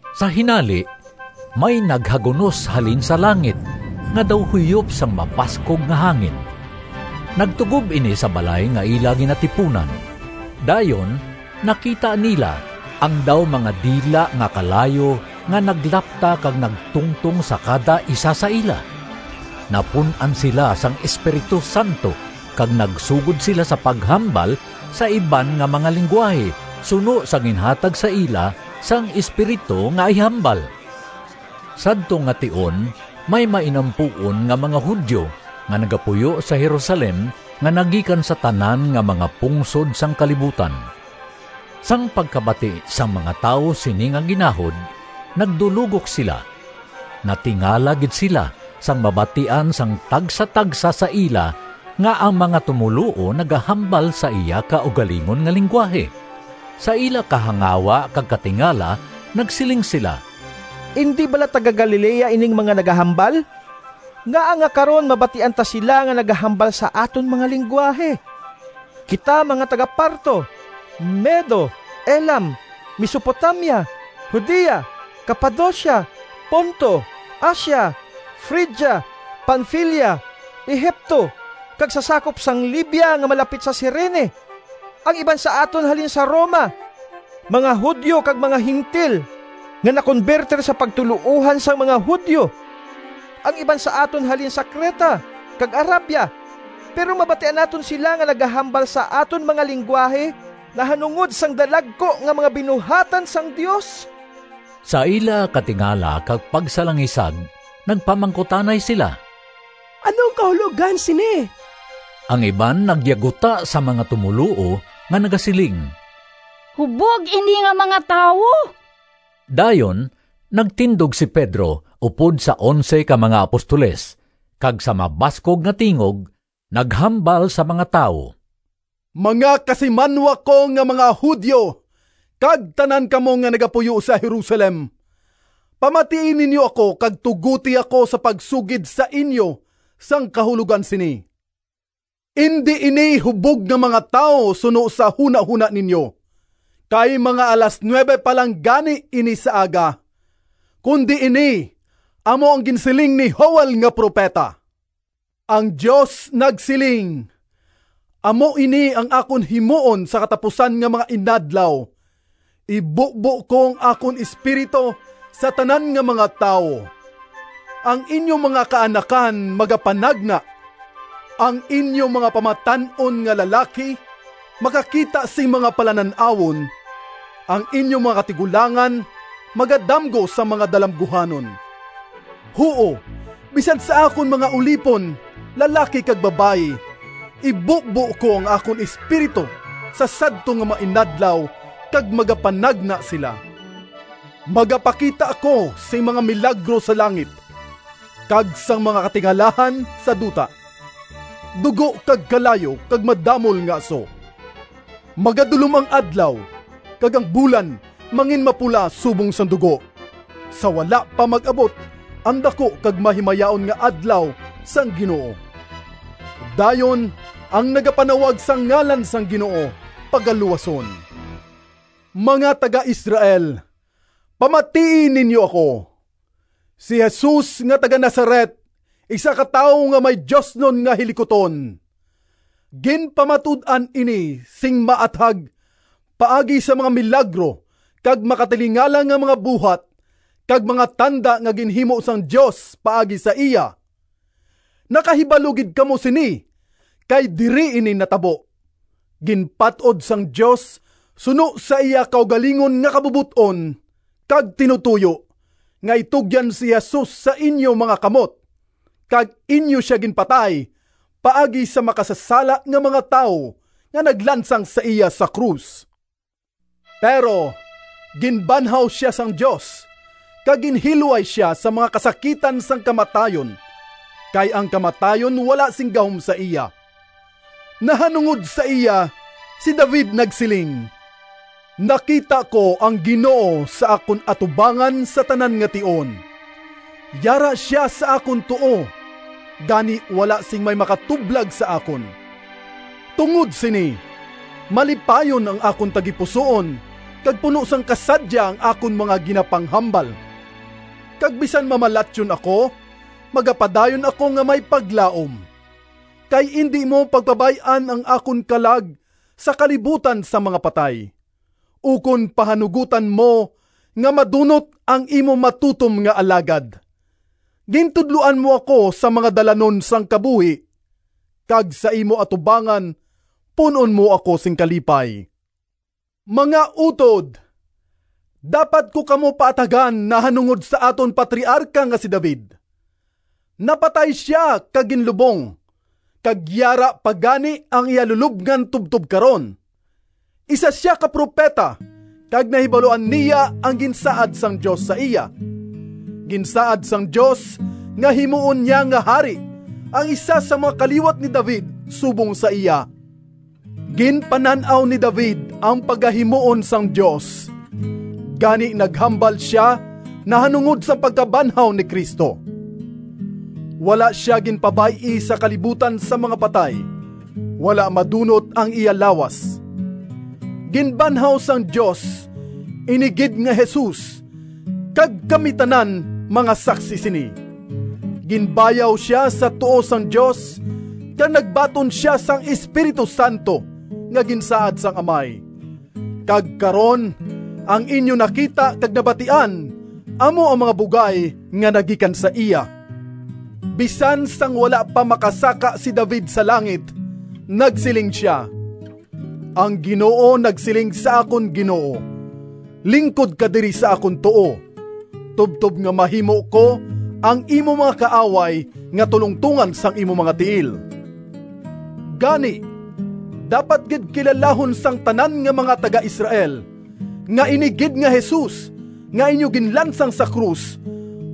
Sa hinali may naghagunos halin sa langit nga daw huyop sang mabaskog nga hangin. Nagtugob ini sa balay nga ila ginatipunan. Dayon nakita nila ang daw mga dila nga kalayo nga naglapta kag nagtungtong sa kada isa sa ila. Napun-an sila sang Espiritu Santo kag nagsugod sila sa paghambal sa iban nga mga linggwahe suno sa ginhatag sa ila sang Espiritu nga ihambal. Sadto nga tion may mainampuon nga mga Judio nga nagapuyo sa Jerusalem nga nagikan sa tanan nga mga pungsod sang kalibutan. Sang pagkabati sang mga tawo sini nga ginahod nagdulogok sila. Natingala gid sila sang mabatian sang tagsatagsa sa ila nga ang mga tumoluo nagahambal sa iya kaugalingon nga linggwahe. Sa ila kahangawa kag katingala nagsiling sila, “Indi bala taga-Galilea ining mga nagahambal? Ngaa nga karon mabatian ta sila nga nagahambal sa aton mga linggwahe? Kita mga taga-Parto, Medo, Elam, Mesopotamia, Judea, Capadocia, Ponto, Asia, Frigia, Panfilia, Egipto, kag sa sakop sang Libya nga malapit sa Cirene. Ang iban sa aton halin sa Roma, mga Judio kag mga Gentil nga nakonbertir sa pagtuloohan sang mga Judio. Ang iban sa aton halin sa Creta kag Arabia. Pero mabatian naton sila nga nagahambal sa aton mga linggwahe nahanungod sang dalagku nga mga binuhatan sang Dios!” Sa ila katingala kag pagsalangisag nagpamangkutanay sila, “Ano ang kahulogan sini?” Ang iban nagyaguta sa mga tumoluo nga nagasiling, “Hubog ini nga mga tawo!” Dayon nagtindog si Pedro upod sa onse ka mga apostoles, kag sa mabaskog nga tingog naghambal sa mga tawo, “Mga kasimanwa ko nga mga Judio, kag tanan kamo nga nagapuyo sa Jerusalem, pamatii ninyo ako kag tugoti ako sa pagsugid sa inyo sang kahulogan sini. Indi ini hubog nga mga tawo suno sa hunahona ninyo, kay mga alas nuwebe pa lang gani ini sa aga, kundi ini amo ang ginsiling ni Joel nga propeta: ‘Ang Dios nagsiling, Amo ini ang akon himuon Sa katapusan nga mga inadlaw, Ibubo ko ang akon Espiritu Sa tanan nga mga tawo. Ang inyo mga kaanakan magapanagna, Ang inyo mga pamatan-on nga lalaki Makakita sing mga palanan-awon, Ang inyo mga katigulangan Magadamgo sang mga dalamguhanon. Huo, bisan sa akon mga ulipon, Lalaki kag babayi, Ibubo ko ang akon Espiritu Sa sadto nga mga inadlaw, Kag magapanagna sila. Magapakita ako Sing mga milagro sa langit, Kag sang mga katingalahan sa duta: Dugo kag kalayo kag madamol nga aso; Magadulom ang adlaw, Kag ang bulan Manginmapula subong sang dugo, Sa wala pa mag-abot ang daku Kag mahimayaon nga Adlaw sang Ginoo. Dayon ang nagapanawag Sa ngalan sang Ginoo pagaluwason.’ “Mga taga-Israel, pamatii ninyo ako! Si Jesus nga taga-Nazaret isa ka tawo nga may diosnon nga hilikuton. Ginpamatud-an ini sing maathag paagi sa mga milagro kag makatilingala nga mga buhat kag mga tanda nga ginhimo sang Dios paagi sa iya. Nakahibalo gid kamo sini kay diri ini matabo. Ginpat-od sang Dios suno sa iya kaugalingon nga kabubot-on kag tinutoyo nga itugyan si Jesus sa inyo mga kamot kag inyo sia ginpatay paagi sa makasasala nga mga tawo nga naglansang sa iya sa krus. Pero ginbanhaw sia sang Dios kag ginhilway sia sa mga kasakitan sang kamatayon, kay ang kamatayon wala sing gahom sa iya. Nahanungod sa iya si David nagsiling: ‘Nakita ko ang Ginoo Sa akon atubangan sa tanan nga tion, Yara sia sa akon tuo, Gani wala sing may makatublag sa akon. Tungod sini Malipayon ang akon tagipusoon Kag puno sang kasadya Ang akon mga ginapanghambal. Kag bisan mamalatyon ako, Magapadayon ako nga may paglaom, Kay indi mo pagpabay-an Ang akon kalag Sa kalibutan sang mga patay, Ukon pahanugotan mo Nga madunot Ang imo matutom nga alagad. Gintudloan mo ako Sang mga dalanon sang kabuhi, Kag sa imo atubangan Pun-on mo ako sing kalipay.’ “Mga utod, dapat ko kamo paathagan nahanungod sa aton patriarka nga si David. Napatay sia kag ginlubong, kag yara pa gani ang iya lulobngan tubtob karon. Isa sia ka propeta kag nahibaluan niya ang ginsaad sang Dios sa iya. Ginsaad sang Dios nga himuon niya nga hari ang isa sang mga kaliwat ni David subong sa iya. Ginpanan-aw ni David ang pagahimuon sang Dios, gani naghambal sia nahanungod sang pagkabanhaw ni Cristo: ‘Wala sia ginpabay-i Sa kalibutan sang mga patay, Wala madunot ang iya lawas.’ Ginbanhaw sang Dios ini gid nga Jesus kag kami tanan mga saksi sini. Ginbayaw sia sa tuo sang Dios, kag nagbaton sia sang Espiritu Santo nga ginsaad sang Amay, kag karon ang inyo nakita kag nabatian amo ang mga bugay nga nagikan sa iya. Bisan sang wala pa makasaka si David sa langit nagsiling sia: ‘Ang Ginoo nagsiling sa akon Ginoo: Lingkod ka diri sa akon tuo, Tubtob nga mahimo ko Ang imo mga kaaway Nga tulongtongan sang imo mga tiil.’ “Gani dapat gid kilalahon sang tanan nga mga taga-Israel, nga ini gid nga Jesus nga inyo ginlansang sa krus,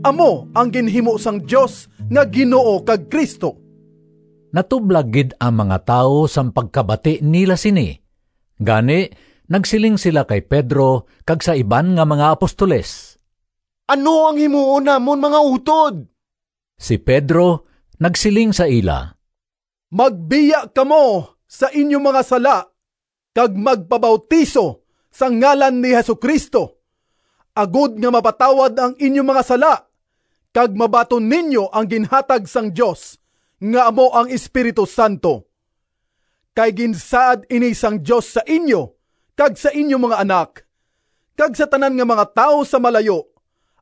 amo ang ginhimo sang Dios nga Ginoo kag Cristo!” Natublag gid ang mga tawo sang pagkabati nila sini. Gani nagsiling sila kay Pedro kag sa iban nga mga apostoles, “Ano ang himuon namon, mga utod?” Si Pedro nagsiling sa ila, “Magbiya kamo sa inyo mga sala kag magpabautiso sa ngalan ni Jesu-Cristo, agod nga mapatawad ang inyo mga sala, kag mabaton ninyo ang ginhatag sang Dios nga amo ang Espiritu Santo. Kay ginsaad ini sang Dios sa inyo kag sa inyo mga anak, kag sa tanan nga mga tawo sa malayo,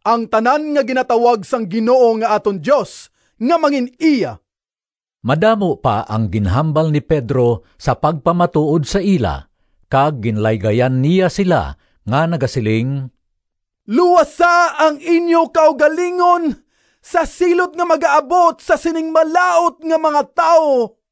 ang tanan nga ginatawag sang Ginoo nga aton Dios nga mangin-iya.” Madamo pa ang ginhambal ni Pedro sa pagpamatuod sa ila kag ginlaygayan niya sila nga nagasiling, “Luwasa ang inyo kaugalingon sa silot nga magaabot sa sining malaut nga mga tawo!”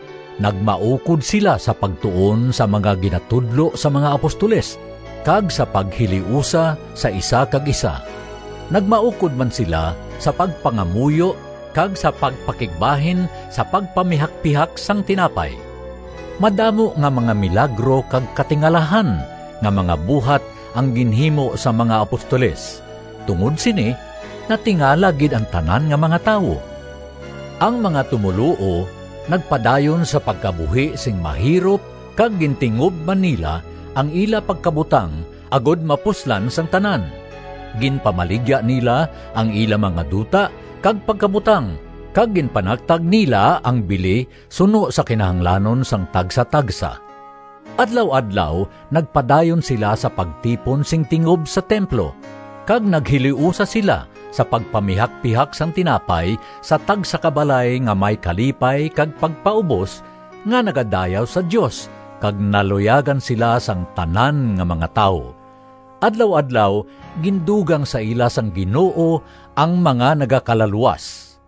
Nagmaukod sila sa pagtuon sa mga ginatudlo sang mga apostoles, kag sa paghiliusa sa isa kag isa. Nagmaukod man sila sa pagpangamuyo kag sa pagpakigbahin sa pagpamihakpihak sang tinapay. Madamo nga mga milagro kag katilingalahan nga mga buhat ang ginhimo sang mga apostoles, tungod sini natingala gid ang tanan nga mga tawo. Ang mga tumoluo nagpadayon sa pagkabuhi sing mahirop kag gintingob man nila ang ila pagkabutang agod mapuslan sang tanan. Ginpamaligya nila ang ila mga duta kag pagkabutang kag ginpanagtag nila ang bili suno sa kinahanglanon sang tagsatagsa. Adlaw-adlaw nagpadayon sila sa pagtipon sing tingob sa templo kag naghiliusa sila sa pagpamihakpihak sang tinapay sa tagsa ka balay nga may kalipay kag pagpaubos, nga nagadayaw sa Dios kag naluyagan sila sang tanan nga mga tawo. Adlaw-adlaw gindugang sa ila sang Ginoo ang mga nagakalaluwas.